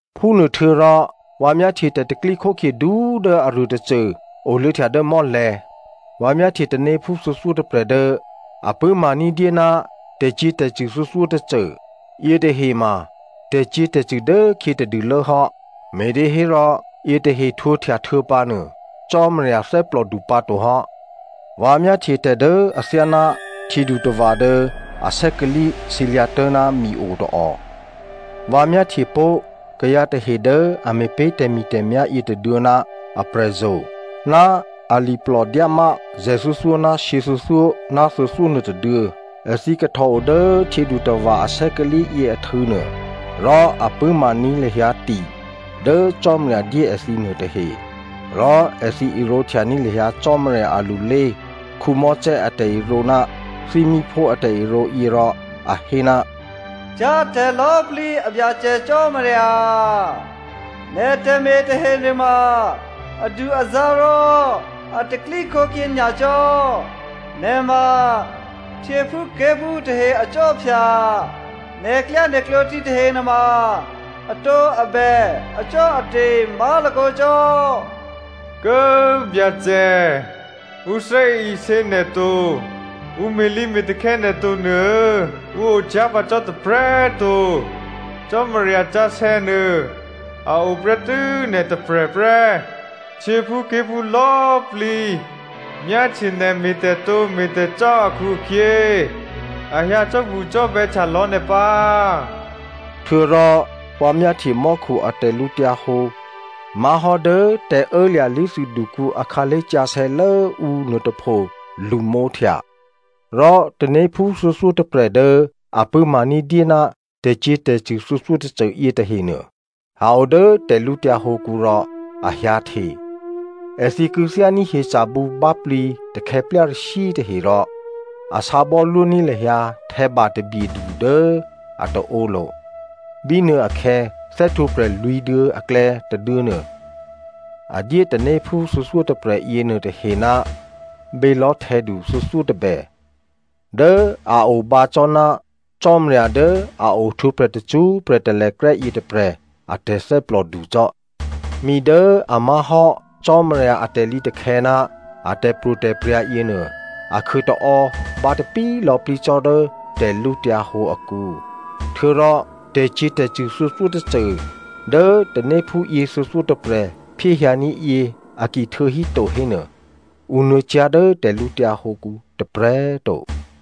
Phúnuôhtuô̌rò vǎ myáhtye tè̤pro̤tè̤prya̤ du꤮ dố aruô tôcô oluô̌htya dố mò́lè̤̌. Vǎ myáhtye tanéphú thuô̌thyótôprè̤ dố a pṳ̂́ma ní̤dyé ná tè̤cyě̤tè̤cṳ̂ thuô̌thyótôcô. Yětahe ma tè̤cyě̤tè̤cṳ̂ dốkhyě tadûlố hò́, me̤těhérò, yětahe htwǒhtya htuô̌pǎnuô, Cò́marya thè́plòdu pǎtohò́. Vǎ myáhtye tè̤ dố athyáná htyědutava̤ dố asè́kalǐ sǐlyǎ̤ tố̤ná mi o tôò. Vǎ myáhtyepó̤ kayǎ tahe dố a me̤pé̤ tè̤mi̤tè̤myá̤ yětôduô̌ ná aprè̤zo̤, ná aliplò dyámá zè̤thuô̌thyó ná shyěthuô̌thyó ná thuô̌thyó nuôtôduô̌. Èthǐ kahtòo dố htyědutava̤ asè́kalǐ yě ahtû̌ nuô, rò a pṳ̂́maní̤ lahyǎ ti dố Cò́marya dyé èthǐ nuôtahe. Rò èthǐ irǒ htyaní̤ lahyǎ Cò́marya alulé Mosè a tè̤irǒ ná thímíphú a tè̤irǒ yě rò a hé, “Cyá̤ tè̤lò̌꤮ plǐ a Byacè Cò́marya꤮ nè̤ tè̤me̤ tahenuô adu-azǎ̤ rò a tè̤pro̤tè̤prya̤ nyacò́. Nè̤ ma htyěphúké̤phú tahe akhwí, nè̤klyánè̤klǒ thǐ tahe nuôma atǒabè acò́ate̤ má̤lakǒ cò́. Kố꤮ Byacè꤮, ǔ thè́isě nè̤ to, ǔ me̤lǐme̤takhè̌ nè̤ to nuô ǔ ocyá̤ pǎ cò́ tôprè̤꤮ to. Cò́marya sǎsè̌ nuô a o prè́tû́ nè̤tôprè̤ prè́. Htyěphúké̤phú lò̌꤮ plǐ myáhtye nè̤ me̤tè̤tǒ me̤tè̤cò́ akhu-akhyě a hyǎ cò́bucò́bè̌htya lò̌ nè̤ pǎ.” Htuô̌rò vǎ myáhtye mò́khu a tè̤lǔhǒdu má̤hò́ dố tè̤ô̌lya̤ lé̤thûdukǔ akhǎlé̤ sǎsè̌lốǔ nuôtôpho lṳmǒhtya. Rò tanéphú thuô̌thyótôprè̤ dố a pṳ̂́ma ní̤dyé ná tè̤cyě̤tè̤cṳ̂ thuô̌thyótôcô yětahenuô, a o dố tè̤lǔtyǎ hǒkǔ rò a hyǎhte. Èthǐ kû̌thyání̤ hyeca̤ bǔbáplǐ takhè̌plyarashyǐ tahe rò a sǎbò́lwó ní̤ lahyǎ htè̌ba tabyedu dố a taǒlo̤. Bínuôakhè̌ thè́htwǒprè̤ lwǐ̤duô̌ aklè̌ tôduô̌ nuô, a dyé tanéphú thuô̌thyótôprè̤ yěnuô tahe ná bělò̤́htè̌du thuô̌thyótôbè dố a o bǎ cò́ ná Cò́marya dố a ohtwǒprè̤ tacṳ́prè̤ talèkrè́ yětôprè̤ a tè̤thè́plòdu cò́. Mi dố a má̤hò́ Cò́marya a tè̤lǐtakhè̌ ná a tè̤pro̤tè̤prya̤ yěnuô, a khuôtaò́ bǎtapí lò̌plǐ cò́ dố tè̤lǔhǒdu akǔ. Htuô̌rò tè̤cyě̤tè̤cṳ̂ thuô̌thyótôcô dố tanéphú yě thuô̌thyótôprè̤ phyéhyǎní̤ yě a ki htuô̌híto hénuô, ǔ nuô̌cyá̤ dố tè̤lǔtyǎ hǒkǔ tôprè̤꤮ to.